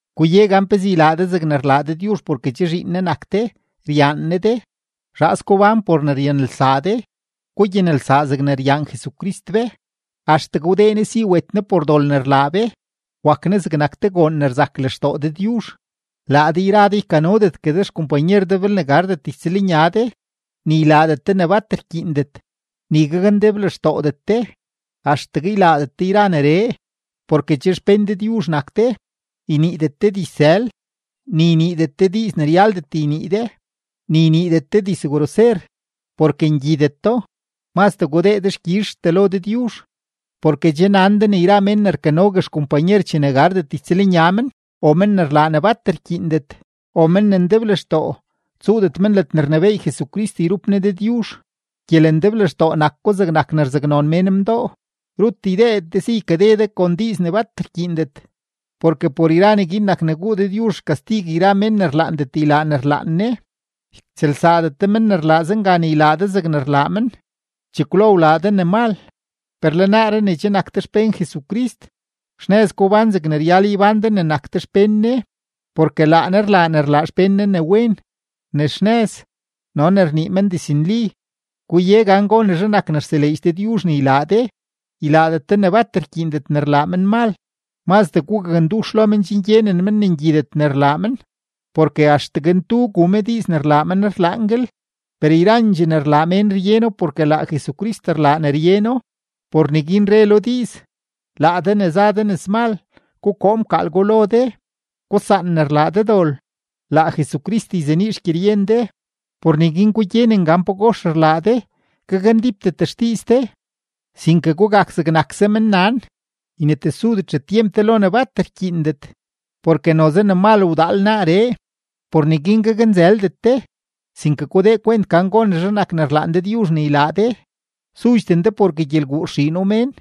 Guye gan pezee ylaa de zegne rlaa Dëdyuzh porke che zhiin Ne nak de, ryaan Ne de. Zhaas gubán por ne ryanelsaa de, gugyanelsaa zegne ryaan Jesucrist be, axtegue wdee Ne si wet Ne por dol ne rlaa be, wak Ne zegnak te goon ne rzak lextoo Dëdyuzh. Laa de yra de ykanodetgue de xkompanyer de belne gardet ytsëlnya de, ni ylaadet de ne bat rkyiindet, ni gakndeblextoodet de, axtegue ylaadet de yra neree, porke che xpén Dëdyuzh nak de. Yniidet de dizsël, ni yniidet de diiz ne ryaldet ynii de, ni yniidet de dizgroser, porke ngyideto; mazdee gudee dexkyizhtee lo Dëdyuzh. Porke che nan de ne yra men ne rkanogue xkompanyer chene gardet ytsëlnya men, o men ne rlaa ne bat rkyiindet, o men ne ndeblextoo, tsuudet men ledne rnebééy Jesucrist yrup Ne Dëdyuzh. (Gyelendeblextoo nak ko zegnak ne rzaknon mén mdoo.) Rut ydeedet de si ykade de kon diiz ne bat rkyiindet. Porke por yra neguin nak ne guu Dëdyuzh xkastig yra mén ne rlaandet ylaa ne rlaan Ne. Ytsëlsaadet de men ne rlaa zenga ne ylaa de zegne rlaa men. Chekwlo wlaa de ne mal, per le naaree ne che nak de xpén Jesucrist, xnëz gubán zegne ryal ybán de ne nak de xpén Ne, porke laa Ne rlaa ne rlaa xpén Ne ne wen, ne xnëz, no ne rnii men diznli. Guye gan gonezhe nak ne rtseleedx Dëdyuzh ne ylaa de. Ylaadet de ne bat rkyiindet ne rlaa menmal, mazdee gugakndux lo men chen gyenen men ne ngyidet ne rlaa men. Porke axtegue ntu gu me diiz ne rlaa men rlaanguel, per yrandxee ne rlaa mén ryeno porke laa Jesucrist rlaa ne ryeno. Por neguin re lo diiz: Laa de ne za de nëzmal, gukoo mkaal gwa lo de. Gusaan ne rlaa de dol, laa Jesucrist yzenii xgyeryen de. Por neguin gugyenen gan pagox rlaa de, gakndípdet xdiiz de, sinke gugak zegnakse mennan; ynetesudet xetyemp de lo ne bat rkyiindet, porke noze ne mal wdaal naaree. Por neguin gaknzëldet de, sinke gudee kwent gan gonezhe nak ne rlaan Dëdyuzh ne ylaa de. Sudxden de porke gyelguu rxiino mén,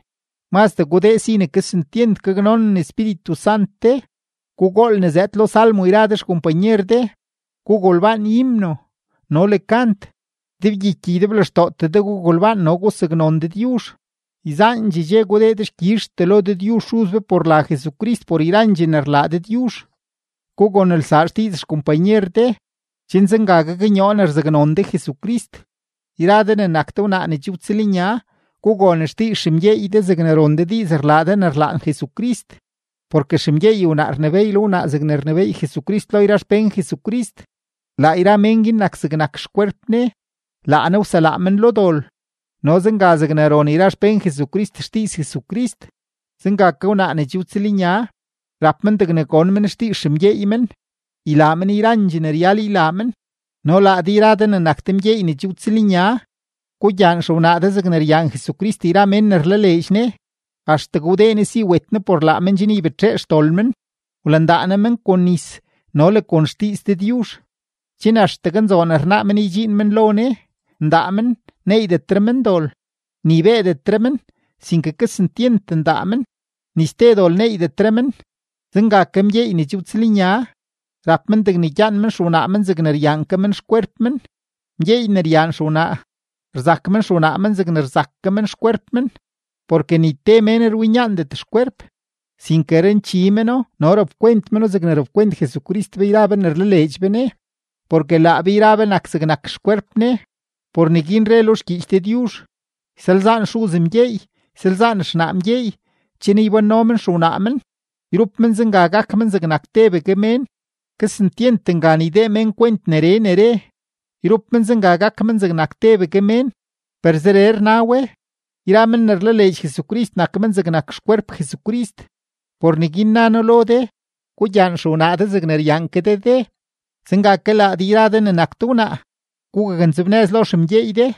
mazdee gudee si ne kesentyent gaknonen Espíritu Sant de. Gugool ne zëëd lo salmo yra de xkompanyer de, gugolbaan himno no le kant. Ydebgyiky ydeblextootee de gugolbaan no gusaknon Dëdyuzh. Yzaandxee dxe gudee dexkyizhtee lo Dëdyuzh Xuz be por la Jesucrist por yrandxee ne rlaa Dëdyuzh. Gugonelsaa xdiiz xkompanyer de, chen zenga gaknyoo ne rzaknon de Jesucrist. Yra de ne nak de wnaa ne che wtsëlnya, gugon xdiiz xemgyeey de zegne ron de diiz rlaa de ne rlaan Jesucrist. Porke xemgyeey wnaa rnebééy lo wnaa zegne rnebééy Jesucrist lo yra xpén Jesucrist; laa yra mén guin nak zegnak xkwerp Ne; laa Ne wselaa men lo dol. No zenga zegne ron yra xpén Jesucrist xdiiz Jesucrist, zenga ke wnaa ne che wtsëlnya, rap men degne gon men xdiiz xemgyeey men, ylaa men yrandxee ne ryal ylaa men. No laa de yra de ne nak de mgyeey ne che wtsëlnya, gugyaan xewnaa de zegne ryaan Jesucrist yra men ne rlaleedx Ne, axtegue wdee Ne si wet Ne por laa men chen ybetxee xdol men, wlandaa Ne men kon nis no le kon xdiiz Dëdyuzh, chen axtegue nzoon rnaa men ydxiin men lo Ne, ndaa men, neeydetre men dol, ni beedetre men, sinke kesentyent ndaa men, ni ste dol neeydetre men. Zenga ke mgyeey ne che wtsëlnya, rap men degne gyaan men xewnaa men zegne ryaan ke men xkwerp men. Mgyeey ne ryaan xewnaa, rzak men xewnaa men zegne rzak ke men xkwerp men. Porke ni te mén rwinyaandet xkwerp, sinke ranchi meno no rapkwent meno zegne rapkwent Jesucrist be yra be ne rlaleedx be Ne, porke laa be yra be nak zegnak xkwerp Ne. Por neguin re lo xgyiich Dëdyuzh: “Ysalzaan xuz mgyeey, ysalzaan xnaa mgyeey, chen ybánno men xewnaa men, yrup men zenga gak men zegnak tebegue mén.” Kesentyent ngan ydee mén kwent neree ne re, “yrup men zenga gak men zegnak tebegue mén”, per zeree rna we: yra men ne rlaleedx Jesucrist nak men zegnak xkwerp Jesucrist. Por neguin na noo lo de, gugyaan xewnaa de zegne ryaan ke de de; zenga ke laa de yra de ne nak de wnaa, gugaknzebnëz lo xemgyeey de.